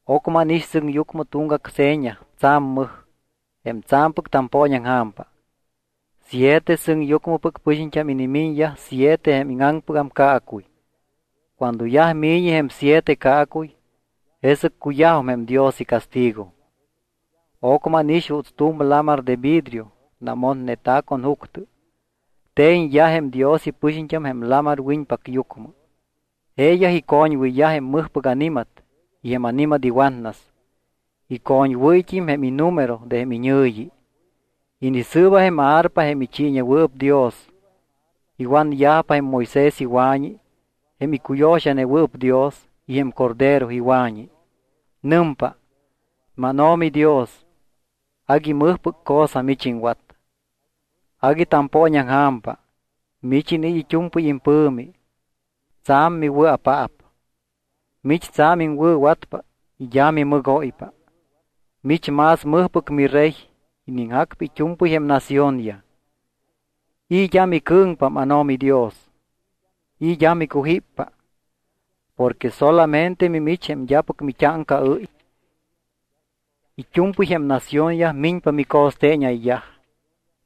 Ocmɨ ánix sɨŋyucmɨ tuŋgac seña tsa̱m mɨj, jém tsa̱mpɨc tampooñaŋja̱mpa. Siete sɨŋyucmɨpɨc pɨxiñt́am inimiñyaj siete jém íŋaŋpɨgam caacuy. Cuando yaj mi̱ñi jém siete caacuy, jesɨc cuyajum jém Dios icastigo. Ocmɨ ánix juuts tu̱m lamar de vidrio namotneta̱ con juctɨ. Te̱ñyaj jém Dios ipɨxiñt́am jém lamar wiñpacyucmɨ. Jeeyaj icoñwɨyyaj jém mɨjpɨc ani̱mat y jém ani̱mat iwatnas. Icoñwɨ́yt́im jém inumero de jém iñɨ̱yi. Inisɨɨba jém arpa jém ichiiñewɨɨp Dios. Iwanyajpa jém Moisés iwa̱ñi jém icuyo̱xanewɨɨp Dios y jém Cordero iwa̱ñi. Nɨmpa: MánO̱mi Dios, agui mɨjpɨc cosa mich iŋwat. Agui tampooñaŋja̱mpa. Mich iniit́ it́u̱mpɨy impɨ̱mi. Tsa̱m miwɨa̱paap. Mich tsa̱m iŋwɨ̱watpa y d́a mimɨgóypa. Mich más mɨjpɨc miRey iniŋjacpa it́u̱mpɨy jém naciónyaj. ¿I̱ d́a micɨ̱ŋpa, mánO̱mi Dios? ¿I̱ d́a micujíppa? Porque solamente mimich jém d́apɨc mit́áŋcaɨ́y. It́u̱mpɨy jém naciónyaj miñpa mico̱steeñayyaj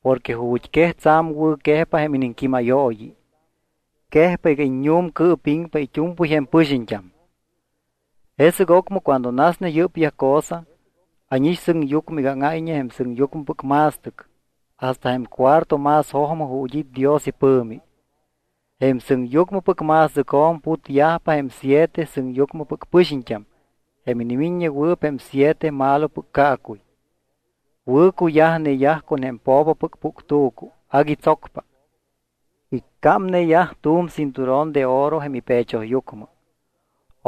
porque ju̱t́quej tsa̱m wɨ̱quejpa jém iniŋquímayooyi. Quejpa iga iññu̱mcɨɨpiŋpa it́u̱mpɨy jém pɨxiñt́am. Jesɨc ocmɨ cuando nasne yɨ́pyaj cosa, ánix sɨŋyucmɨ iga áŋáyñe jém sɨŋyucmɨpɨc ma̱stɨc hasta jém cuarto más jojmɨ ju̱t́ it́ Dios ipɨ̱mi. Jém sɨŋyucmɨpɨc ma̱stɨcjo̱m putyajpa jém siete sɨŋyucmɨpɨc pɨxiñt́am jém inimiññewɨɨp jém siete malopɨc caacuy. Wɨ̱cuyajneyaj con jém po̱popɨc puctu̱cu agui tsocpa. Iccámneyaj tu̱m cinturón de oro jém ipechoyucmɨ.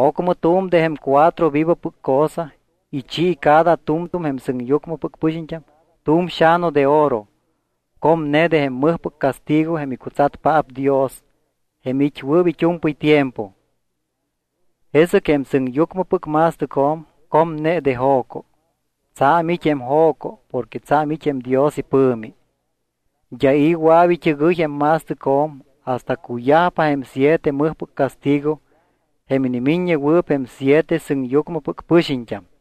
Ocmɨ tu̱m de jém cuatro vivopɨc cosa ichi cada tu̱m tu̱m jém sɨŋyucmɨpɨc pɨxiñt́am tu̱m xa̱nu de oro comne de jém mɨjpɨc castigo jém icutsatpaap Dios jém it́wɨɨp it́u̱mpɨy tiempo. Jesɨc jém sɨŋyucmɨpɨc ma̱stɨcjo̱m comne de jo̱co. Tsa̱m it́ jém jo̱co porque tsa̱m it́ jém Dios ipɨ̱mi. D́a i̱ wɨa̱p it́ɨgɨy jém ma̱stɨcjo̱m hasta cuyajpa jém siete mɨjpɨc castigo jém inimiññewɨɨp jém siete sɨŋyucmɨpɨc pɨxiñt́am.